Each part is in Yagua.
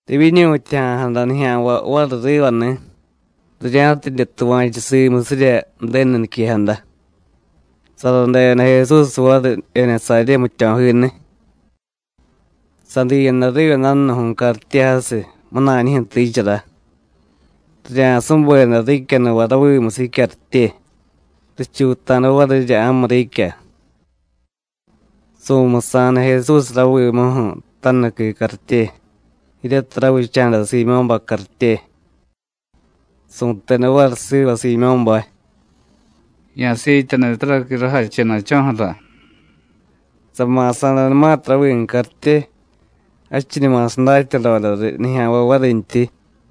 Rivyiñutyaja̱jada nijya̱nvay variy rivani̱, rirya̱tidye tuva̱chu simusirya Ju̱denu niquejada. Saradeda Jesús variy Jenesaryé jmityo̱jiniy. Sadiyada riva dajnuju̱y cartye jasiy, munañijyu̱ tiichara. Rirya̱subeda riicyanuvay ravimusiy jicyartye, richuuta̱da varirya ja̱mu riicya. Su̱musa̱da Jesús ravimuju̱ tajnuqui cartye, jiryatiy ravicha̱da Siimyó̱bay cartye. Su̱teda variy siva Siimyó̱bay: “Ya̱siityaniy taraqui rajachena̱cho̱ju̱ra.” Sama̱sa̱danumatiy ravimu cartye, jadchiñuma sadatyadoda riy nijya̱nvay varintyi.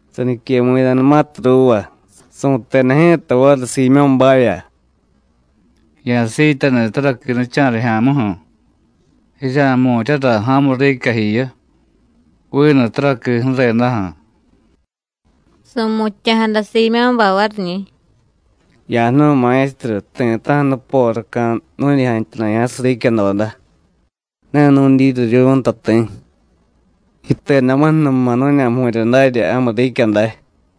Saniquemu̱yadanumatiy ruuva, su̱teda ji̱ta variy Siimyó̱bavya: “Ya̱siityaniy taraqui nicha̱rijya̱muju̱. Jirya̱jmu̱ryara ja̱mu riicya jiyu, vinu taraqui ju̱redaju̱.” Su̱mutya̱jada Siimyó̱bay variñi̱: “Ya̱jnu̱y Maestru, ti̱ta̱ju̱ nuporaca̱ nu̱ñi jantyana̱ya̱jasiy riicyadoda, ne nu̱dyiryiryu̱y nta ti̱. Yitedamuju̱numa nu̱ña̱jmu̱rya darya ja̱mu riicya day.”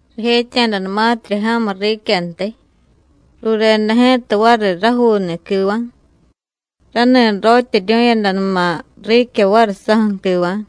Rijetya̱danumatirya ja̱mu riicyantiy, rureda ji̱ta variy rajuuni̱ quiva̱, rani rotyeryu̱yadanuma riicya variy sáju̱ quiva̱.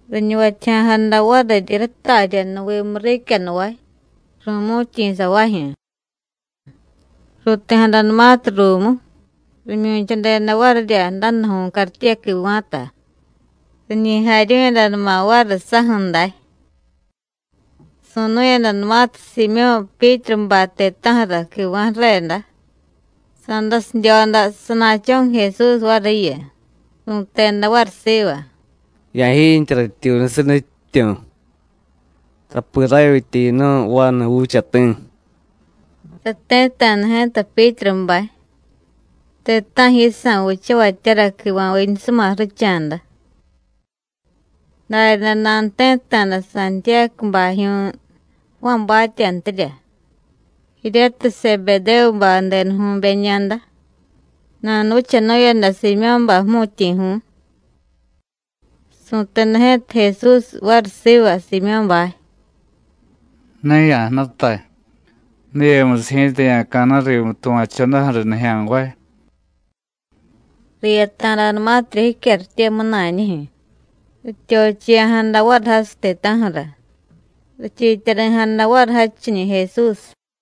Riñuvatyaja̱jada variryi ratarya jnuvimu riicyanuvay, ru̱mu̱tyi̱savajyu̱. Ruuti̱jadanumatiy ruumu, rimyu̱chadeda varirya dajnuju̱y cartye quiva̱ta, riñi jaryu̱yadanuma variy sáju̱ day. Su̱nu̱yadanumatiy Siimyó̱ Pyítrubay ti̱ta̱ju̱ra quiva̱ ju̱reda, sa̱dasidyoda sana̱cho̱ju̱ Jesús variyu, su̱teda variy siva: “Ya̱jiintye ratyuunusiy, Nutyityu̱, tapi ravyitya yinu̱y vanu juuchati̱.” Sati̱tta̱da ji̱ta Pyítrubay, ti̱ta̱ju̱ yisa̱ vichavatyara quiva̱viñusuma ju̱richa̱da. Daryaday nanuti̱tta̱da Santiyácubajyu̱y Juánbatyantirya, jiryatiy Sebedévubay denuju̱beñada. Nanuvichanu̱yada Siimyó̱bay jmu̱tyi̱ju̱y. Su̱teda ji̱ta Jesús variy siva Siimyó̱bay: “Ne ya̱jnutay, diyemusiy ji̱ta ya̱ca̱na̱y rimu tuva̱chodaju̱ riy nijya̱nvay.” Riyata̱danumatirya jicyartye munañijyu̱, rityochiya̱jada variy jasiy ti̱ta̱ju̱ra, richiityari̱jada variy jadchiñi̱ Jesús.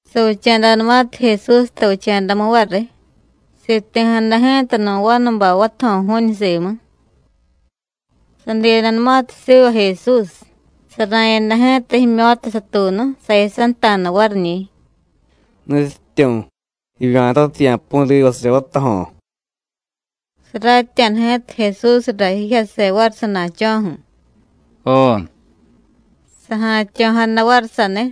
Savicha̱danumatiy Jesús tavicha̱damu variy, siti̱jada ji̱ta nu̱ vanubay vatajo̱ju̱ñu simu. Sadiyadanumatiy siva Jesús, sara̱yada ji̱ta jimyo̱ta satuunu, sayasanta̱da variñi̱: “Nutyityu̱, jivya̱tatiy, ya̱pu̱y rivasirya vatajo̱.” Saratya̱da ji̱ta Jesúsra jijyase variy sana̱cho̱ju̱, “Jo,” saja̱tyo̱jada variy saniy.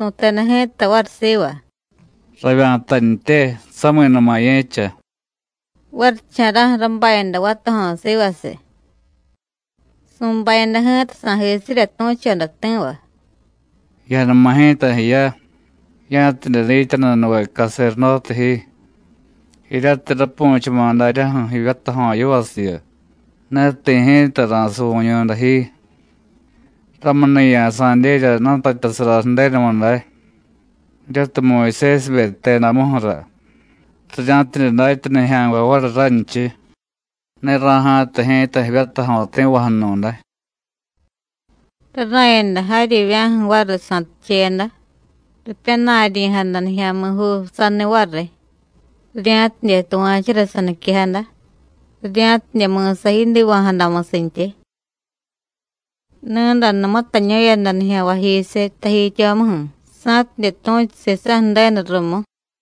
Su̱teda ji̱ta variy siva: “Ravya̱tantye, sami̱numa ye̱cha.” Varicha̱ra̱ju̱ rabayada vatajo̱ sivasiy. Su̱bayada ji̱ta sa̱jisirya tu̱choda ti̱va. “Ya̱numa ji̱ta jiya, ya̱tidye dityanunuve caserdóte ji. Jiryatiy rapu̱chama̱ daryaju̱ jivyatajo̱ yivasiyu, ne ti̱ ji̱ta ra̱suvu̱ñu̱day ji. Ramuni̱ ya̱sa̱dyerya jnutatyasara Ju̱denumu day, jiryatiy Muyusésibe jtedamuju̱ra, rirya̱tidye datya nijya̱nvay variy ranchiy: Ne ra̱ja̱tay ji̱ta jivyatajo̱ ti̱vaju̱nu̱day.” Rara̱yada jaryivya̱ju̱ variy sa̱ticheyada, ripyana̱ryi̱jada nijya̱mi̱juu saniy variy, rirya̱tidye tuva̱chura saniquejada, rirya̱tidye mi̱sa yidiva̱jadamusintyi. Ni̱day numutañu̱yada nijya̱nvayjisiy tajityomuju̱, sa̱tidye tu̱chu sisa̱ Ju̱denu rumu.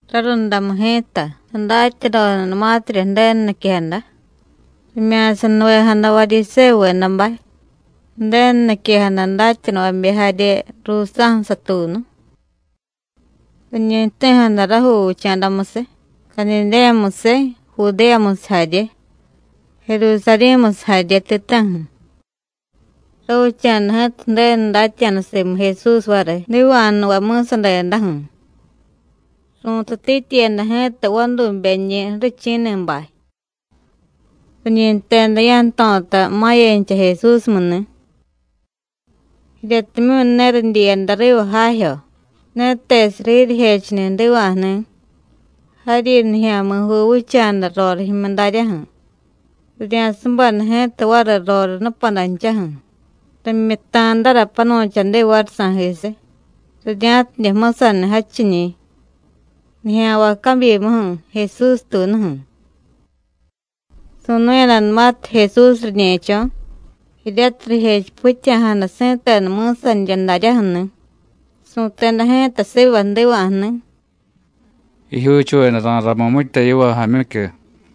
Rarundamu ji̱ta, sadatyadodanumatirya Ju̱denu niquejada, rimya̱sanuvejada Varyisévuvedabay, Ju̱denu niquejada datyanuvabe jarye ruusa̱ju̱ satuunu. Riñi jti̱jada rajuu vicha̱damusiy, Cadidéyamusiy, Judéyamusiy jarye, Jerusarí̱musiy jarye ti̱ta̱ju̱. Ravicha̱da ji̱ta Ju̱denu datya̱da simu Jesús variy jdiva̱jnuvay mi̱sadedaju̱. Ru̱tutityiyada ji̱ta vadubeñi̱ ju̱richi̱ni̱bay. Riñi jteda ya̱jto̱ta ma̱yancha Jesúsmu ni̱. Jiryatimyu̱ ne ridyiyada riva jajyo, ne tesiy riryijechuni̱ jdiva̱jni̱, jaryi nijya̱mi̱juu vicha̱da rorijyu̱mu daryaju̱, rirya̱subeda ji̱ta variy roriy nupadanchaju̱, rimyutta̱dara panu̱chadi variy sa̱jisiy, rirya̱tidye jmusaniy jadchiñi̱, nijya̱nvay cabyimuju̱, Jesústuunuju̱. Su̱nu̱yadanumatiy Jesús riñe̱cho̱, jiryatiy rijechipityaja̱jada si̱tenu mi̱sanirya daryaju̱ni̱, su̱teda ji̱ta siva jdiva̱jni̱: “Jijyuuchuveda ra̱ramiy mitya yiva, jaamyicyu.”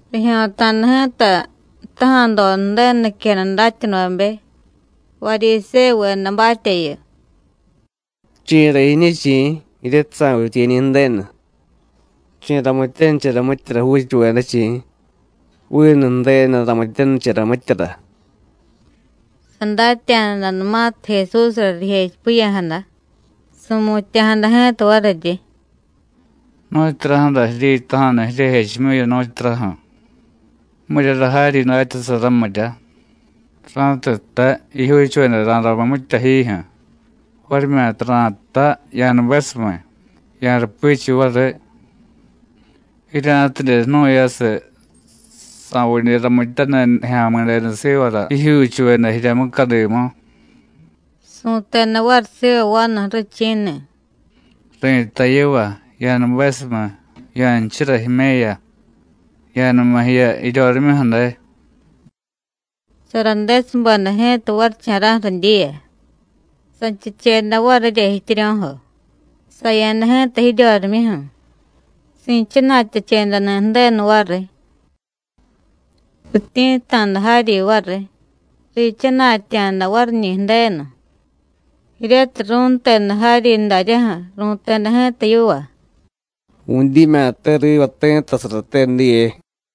Rijyo̱ta̱da ji̱ta jtaja̱doda Ju̱denu niquejada datyanuvabe Varyisévuvedabatyayu: “¿Chi̱ra jiñu, chi̱? jiryatiy sa̱vityiye̱ñi̱ Ju̱denu. ¿Chi̱ ramityanichara mityara juuchuveda, chi̱? Vinu Ju̱denu ramityanichara mityara.” Sadatya̱danumatiy Jesúsra rijechipiya̱jada, su̱mutya̱jada ji̱ta variryi: “¿Nu̱tyuraju̱ra jiryitaja̱nu jiryejechimyuyu, nu̱tyuraju̱? ¿Miryara jaryi datyasara, mirya? ra̱tiy jtay: Jijyuuchuveda ra̱ramiy mitya jijyu̱, varimyata ra̱jtay: Ya̱nubesumiy, ya̱rupichiy variy. Jirya̱tidye jnu̱yasiy sa̱vidye ramityaniy Nijya̱mi̱denu sivara jijyuuchuveda jirya mucadimu,” su̱teda variy siva vanu ju̱richi̱ni̱: “Ri̱tay yiva: Ya̱nubesumiy, ya̱nchura jime̱ya, ya̱numa jiya jiryorimyuju̱ day.” Saradesubeda ji̱ta varicha̱ra̱ju̱ ridyiya, sanchucheda varirya jityiryo̱jo, saya̱da ji̱ta jiryorimyuju̱, si̱chana̱tyachedani̱ Ju̱denu variy. Rityi̱tta̱da jaryi variy, riichana̱tya̱da variñi̱ Ju̱denu, jiryatiy ru̱nteda jaryi daryaju̱, ru̱teda ji̱ta yiva: “¡Vu̱dyimya̱te riva ti̱ttasarate diye!”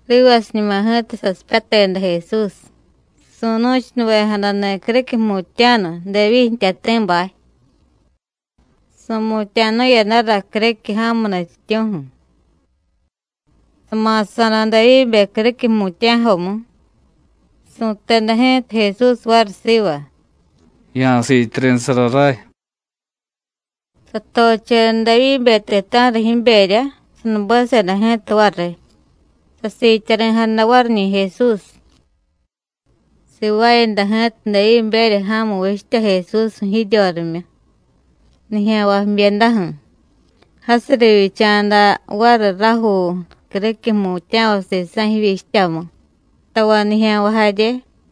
Rivasiñuma ji̱ta sasipyateda Jesús, su̱nu̱chunuvejadani̱ criquiy jmutya̱nu, Devyíy jtyati̱bay. Su̱mutya̱nu̱yadara criquiy ja̱mu nutyityu̱ju̱. Sama̱sa̱da Devyíbe criquiy jmutya̱jomu. Su̱teda ji̱ta Jesús variy siva: “Ya̱siityari̱sara ray.” Satocheda Devyíbe ti̱ta̱ju̱ra jiberya, sanubeseda ji̱ta variy, sasiityari̱jada variñi̱ Jesús. Sivaayada ji̱ta Devyíberya ja̱mu vichtya Jesúsju̱ jiryorimyu, nijya̱nvay jbyedaju̱. Jasiy rivyicha̱da variy rajuu criquiy jmutya̱vay sisa̱ jivyichtyamu, tavay nijya̱nvay jarye.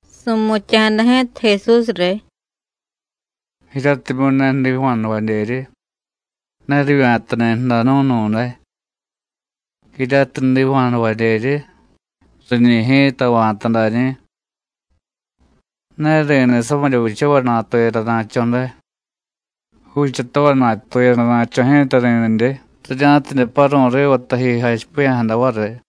Su̱mutya̱jada ji̱ta Jesús riy: “Jiryatimyu̱ ne jdiva̱jnuvadyeryi, ne rivya̱tani̱ ju̱danu̱nu̱day; jiryatiy jdiva̱jnuvadyeryi, riñi̱ ji̱ta va̱ta dañi̱. Ne ri̱niy samirya vichavay natuyadana̱cho̱ day, juuchatavay natuyadana̱cho̱ ji̱ta ri̱nidye, rirya̱tidye paru̱y riva taji jachipiya̱jada variy.”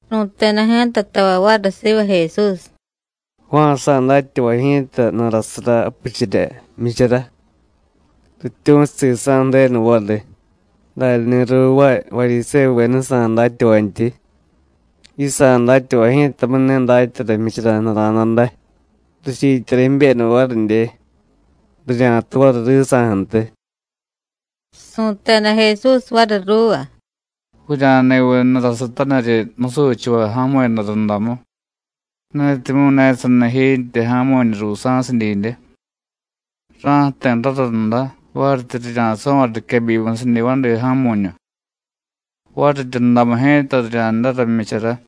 Ru̱teda ji̱ta tavay variy siva Jesús: “Juánjsa̱ datyavay ji̱ta jnurasara japichirya jmyichara, rityu̱chu sisa̱ Ju̱denu variy, daryani̱ ruuvaay Varyisévuvedajsa̱ datyavantyi. Yisa̱ datyavay ji̱tamu̱y ne datyara jmyichara jnura̱da day; richiityari̱ jibyeda varidye, rirya̱tu variy risa̱ju̱ntiy.” Su̱teda Jesús variy ruuva: “¿Vurya̱ni̱viy jnurasutaniryi musuchavay ja̱mu̱yada rundamu, netimyu̱ ne sani jiintye ja̱mu̱ñu ruusa̱sidyidye? Ra̱jti̱ rarunda varityi rirya̱so̱vay riquebyimusiñi̱ vadi ja̱mu̱ñu, variryundamu ji̱ta rirya̱ndara jmyichara.”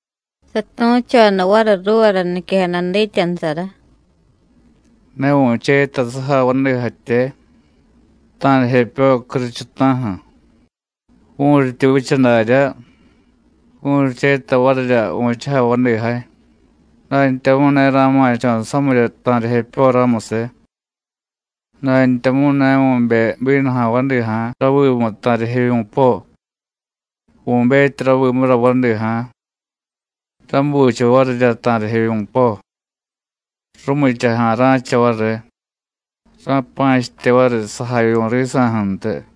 Satu̱choda variy ruuvara niquejada dityanusara: “Ne vu̱cheta sujay vadijatye, ta̱rijepyo curuchuta̱ju̱. Vu̱ryityi vicha darya, vu̱ryicheta varirya vu̱chujay vadijay, dantyamu̱y ne ra̱ma̱cho̱ samirya ta̱rijepyo ramusiy. Dantyamu̱y ne vu̱bey bínuja̱ vadija̱ ravimu ta̱rijevyu̱po; vu̱betyi ravimura vadija̱, ra̱bucha varirya ta̱rijevyu̱po, rumichaja̱ ra̱cha variy, ra̱pa̱chitye variy sajavyu̱ risa̱ju̱ntiy.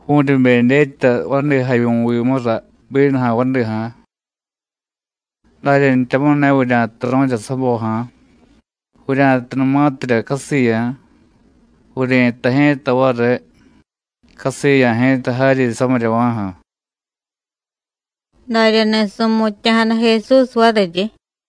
Vu̱ryibe dyetya vadijavyu̱vimura bínuja̱ vadija̱. Daryantyamu̱y ne vurya̱turu̱rya saboja̱, vurya̱tunumatirya casiya̱, vuryi̱tay ji̱ta variy: Casiya̱ ji̱ta jaryi samiryava̱ju̱.” Daryani̱ su̱mutya̱jada Jesús variryi.